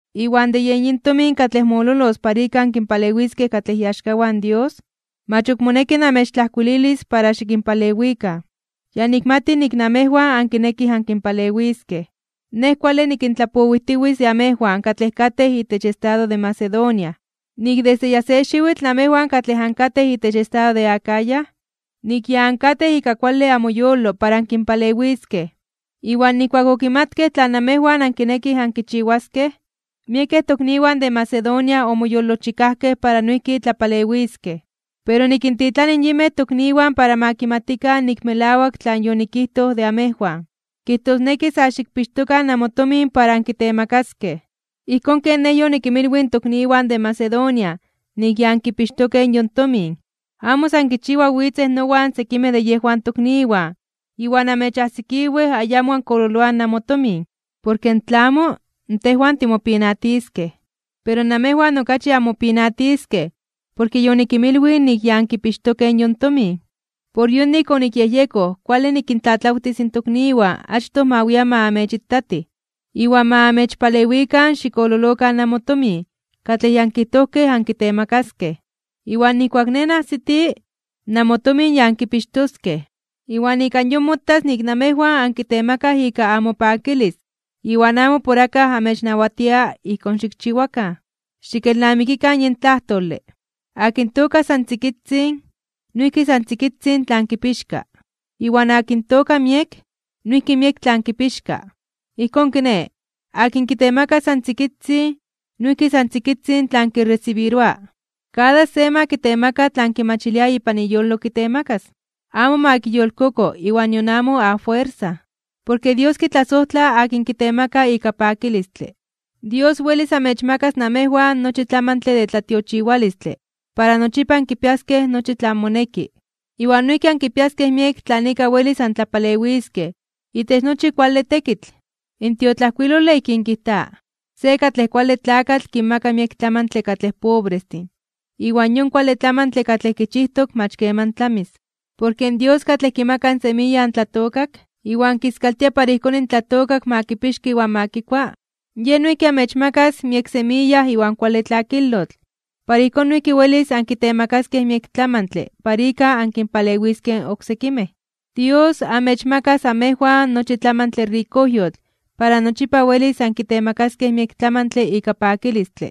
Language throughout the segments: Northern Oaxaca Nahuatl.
Iwan de yen yin tomin katlej mololos para ika ankinpalewiskej katlej iaxkawan Dios, mach ok moneki namechtlajkuililis para xikinpalewikan. Ya nikmati nik namejwan ankinekij ankinpalewiskej. Nej kuale nikintlapowijtiwitz de amejwan katlej katej itech estado de Macedonia, nik desde ya se xiwitl namejwan katlej ankatej itech estado de Acaya, nik ya ankatej ika kuale amoyolo para ankinpalewiskej. Iwan nijkuak okimatkej tlan namejwan ankinekij ankichiwaskej, miekej tokniwan de Macedonia omoyolojchikajkej para noijki tlapalewiskej. Pero nikintitlani yinmej tokniwan para ma kimatikan nik melawak tlan yonikijtoj de amejwan. Kijtosneki sa xikpixtokan namotomin para ankitemakaskej, ijkón ken nej yonikinmilwij in tokniwan de Macedonia nik ya ankipixtokej yon tomin. Amo san kichiwa witzej nowan sekimej de yejwan tokniwan iwan anmechajsikiwej ayamo ankololoaj namotomin. Porke tla amo, tejwan timopinatiskej, pero namejwan okachi anmopinatiskej porke yonikinmilwij nik ya ankipixtokej yon tomin. Por yonik onikyejyekoj kuale nikintlatlawtis in tokniwan achtoj ma wian ma amechitatij, iwan ma amechpalewikan xikololokan namotomin katlej ya ankijtojkej ankitemakaskej. Iwan nijkuak nej najsiti, namotomin ya ankipixtoskej, iwan ika yon motas nik namejwan ankitemakaj ika amopakilis iwan amo por akaj amechnawatia ijkón xikchiwakan. Xikelnamiktokan yin tlajtole: Akin tooka san tzikitzin (achitzin), noijki san tzikitzin tlan kipixka. Iwan akin tooka miek, noijki miek tlan kipixka. Ijkón kiné, akin kitemaka san tzikitzin noijki san tzikitzin tlan kiresibiroa. Kada se ma kitemaka tlan kimachilia ipan iyolo kitemakas. Amo ma kiyolkoko iwan nion amo afuersa. Porke Dios kitlasojtla akin kitemaka ika pakilistle. Dios welis amechmakas namejwan nochi tlamantle de tlatiochiwalistle para nochipa ankipiaskej nochi tlan moneki, iwan noijki ankipiaskej miek tlan ika welis antlapalewiskej itech nochi kuale tekitl. In tiotlajkuilole ijkín kijta: Se katlej kuale tlakatl kinmaka miek tlamantle katlej pobrestin, iwan yon kuale tlamantle katlej kichijtok mach keman tlamis. Porke in Dios katlej kimaka semiya in tlatookak, iwan kiskaltia para ijkón in tlatookak ma kipixka iwan ma kikua, Yej noijki amechmakas miek semiya iwan kuale tlakilotl para ijkón noijki welis ankitemakaskej miek tlamantle para ika ankinpalewiskej oksekimej. Dios amechmakas amejwan nochi tlamantle rikojyotl para nochipa welis ankitemakaskej miek tlamantle ika pakilistle.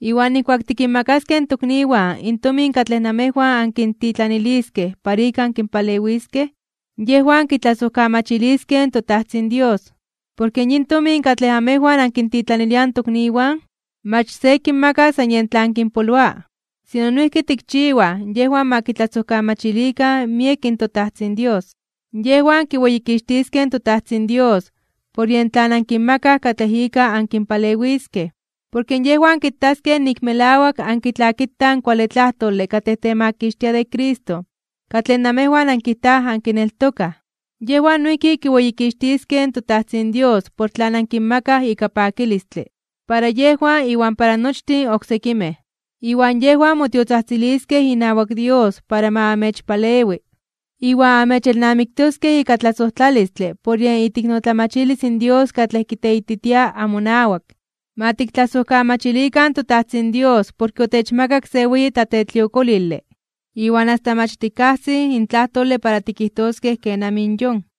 Iwan nijkuak tikinmakaskej in tokniwan in tomin katlej namejwan ankintitlaniliskej para ika ankinpalewiskej, yejwan kitlasojkamachiliskej in toTajtzin Dios. Porke yin tomin katlej amejwan ankintitlaniliaj in tokniwan, mach se kinmaka san yen tlan kinpoloa, sino noijki tikchiwaj yejwan ma kitlasojkamachilikan miek in toTajtzin Dios. Yejwan kiweyikixtiskej in toTajtzin Dios por yen tlan ankinmakaj katlej ika ankinpalewiskej, porke yejwan kitaskej nik melawak ankitlakitaj in kuale tlajtole katlej temakixtia de Cristo katlej namejwan ankijtaj ankineltokaj. Yejwan noijki kiweyikixtiskej in toTajtzin Dios por tlan ankinmakaj ika pakilistle, para yejwan iwan para nochtin oksekimej. Iwan yejwan motiotzajtziliskej inawak Dios para ma amechpalewi, iwan amechelnamiktoskej ika tlasojtlalistle por yen iteiknotlamachilis in Dios katlej kiteititia amonawak. Ma tiktlasojkamachilikan in toTajtzin Dios porke otechmakak se weyi tlatetliokolile, iwan asta mach tikajsij in tlajtole para tikijtoskej kenamij in yon.